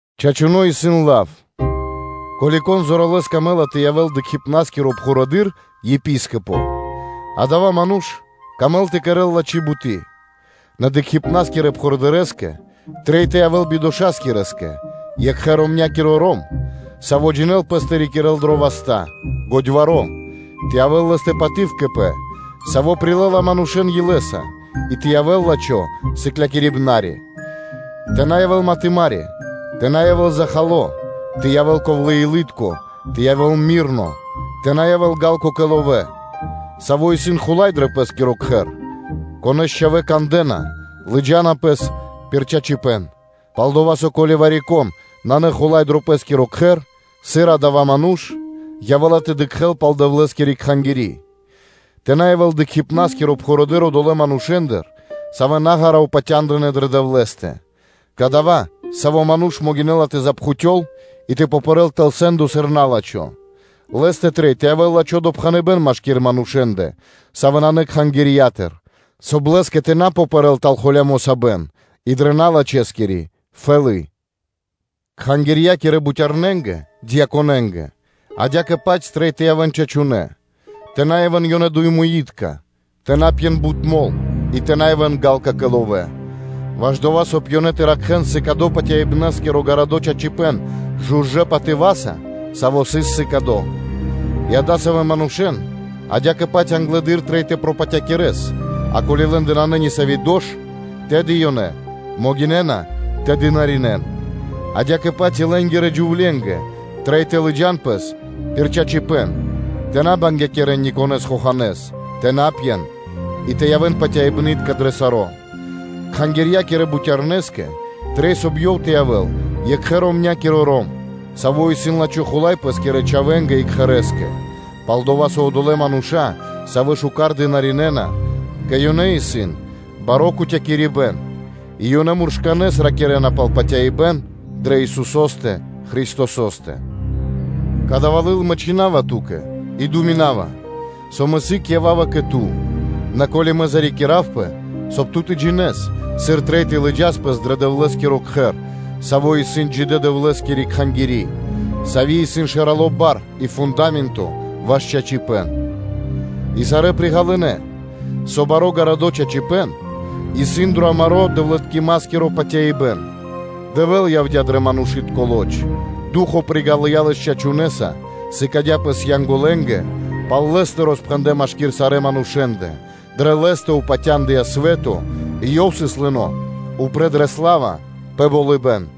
Чачуно́ исын лав, ко́ли кон зоралэ́с камэ́ла тэ явэ́л кхангирья́киро барыдыро́ (епископо), адава́ ману́ш мангэ́ла тэ кэрэ́л лачхи́ буты́. Нэ кхангирья́кирэ барыдырэ́скэ трэй тэ явэ́л бидошакирэскэ, екхэ – ромнякиро ром, саво́ джинэ́л пэс тэ рикирэ́л дрэ васта́, годьваро́, тэ явэ́л лэ́стэ паты́в кэ пэ, саво́ прилэ́ла манушэ́н илэ́са, и тэ явэ́л лачхо́ сыклякирибна́скиро (учителё); тэ на явэ́л матымари, тэ на явэ́л захало, нэ тэ явэ́л ковлэ́-илытко, тэ явэ́л раманёно (ми́рно), тэ на явэ́л ґа́лко кэ ловэ́, саво́ исын хула́й пэ пэ́скиро кхэр, конэ́с чхавэ́ кандэ́на, лыджа́на пэс пир чачипэ́н; пал-дова́ со, ко́ли вари-кон нанэ хула́й дро пэ́скиро кхэр, сыр адава́ ману́ш явэ́ла тэ дыкхэ́л пал Дэвлэ́скири Кхангири́? Тэ на явэ́л кхангирья́киро барыдыро́ одолэ́ манушэ́ндыр, савэ́ наґара упатя́ндынэ дрэ Дэвлэ́стэ, кадава́ саво́ ману́ш могинэ́ла тэ запхутёл, и тэ пэрэ́л тэл сэ́ндо сыр на́лачхо. Лэ́стэ трэй тэ явэ́л лачхо́ допхэныбэ́н машки́р манушэ́ндэ, савэ́ нанэ кхангирья́тыр, соб (кай) лэ́скэ тэ на попэрэл тэл холямо́ сабэн и дрэ налачхэскири фэлы́. Кхангирья́кирэ бутярнэнгэ (диаконэнгэ) адя́кэ-паць трэй тэ явэ́н чачунэ́, тэ на явэ́н ёнэ дуемуитка, тэ на пьен бут мол, и тэ на явэ́н ґалка (жадна) кэ ловэ́, ваш дова́, соб (кай) ёнэ тэ ракхэ́н сыкадо патяибнаскиро гарадо́ чачипэ́н жужэ́ патыва́са, саво́ сыс сыкадо. И адасавэ́ манушэ́н адя́кэ-паць англэды́р трэй тэ пропатякирэс, и ко́ли лэ́ндэ нанэ нисави́ дош, тэды ёнэ могинэ́на тэ дынаринэ́н (тэ служынэн). Адя́кэ-паць и лэ́нгирэ джувленгэ трэй тэ лыджа́н пэс пир чачипэ́н, тэ на бангякирэн никонэ́с хоханэ́с, тэ на пьен, и тэ явэ́н патяибнытка дро саро́. Кхангирья́кирэ бутярнэскэ трэй, соб (кай) ёв тэ явэ́л екхэ-ромнякиро ром, саво́ исын лачхо́ хула́й пэ́скирэ чхавэ́нгэ и кхэрэ́скэ: пал-дова́ со одолэ́ мануша́, савэ́ шука́р дынаринэна, кэ ёнэ исын баро́ кутякирибэн и ёнэ муршканэ́с ракирэ́на пал патяибэ́н дрэ Исусо́стэ Христосо́стэ. Кадава́ лыл мэ чхина́ва ту́кэ, и думинава, со мэ сыг ява́ва кэ ту; нэ ко́ли мэ зарикиравпэ, соб (кай) ту тэ джинэ́с, сыр трэй тэ лыджас пэс дрэ Дэвлэ́скиро Кхэр, саво́ исын джидэ́ – Дэвлэ́скири Кхангири́, сави́ исын шэрало́ бар и фунда́менто ваш чачипэ́н. И сарэ́ приґалынэ, со баро́ гарадо́ чачипэ́н исын дро амаро́ дэвлыткимакиро патяибэ́н: Дэвэ́л явдя́ дрэ манушы́тко лоч (плоть), Ду́хо (Фа́но) приґалыя Лэс чачунэса, сыкадя́ Пэс Янголэнгэ, пал Лэ́стэ роспхэндлэ́ машки́р сарэ́ манушэ́ндэ, дрэ Лэ́стэ упатяндыя свэ́то и Ёв сыс лыно́ упрэ́ дрэ сла́ва пэ болыбэ́н.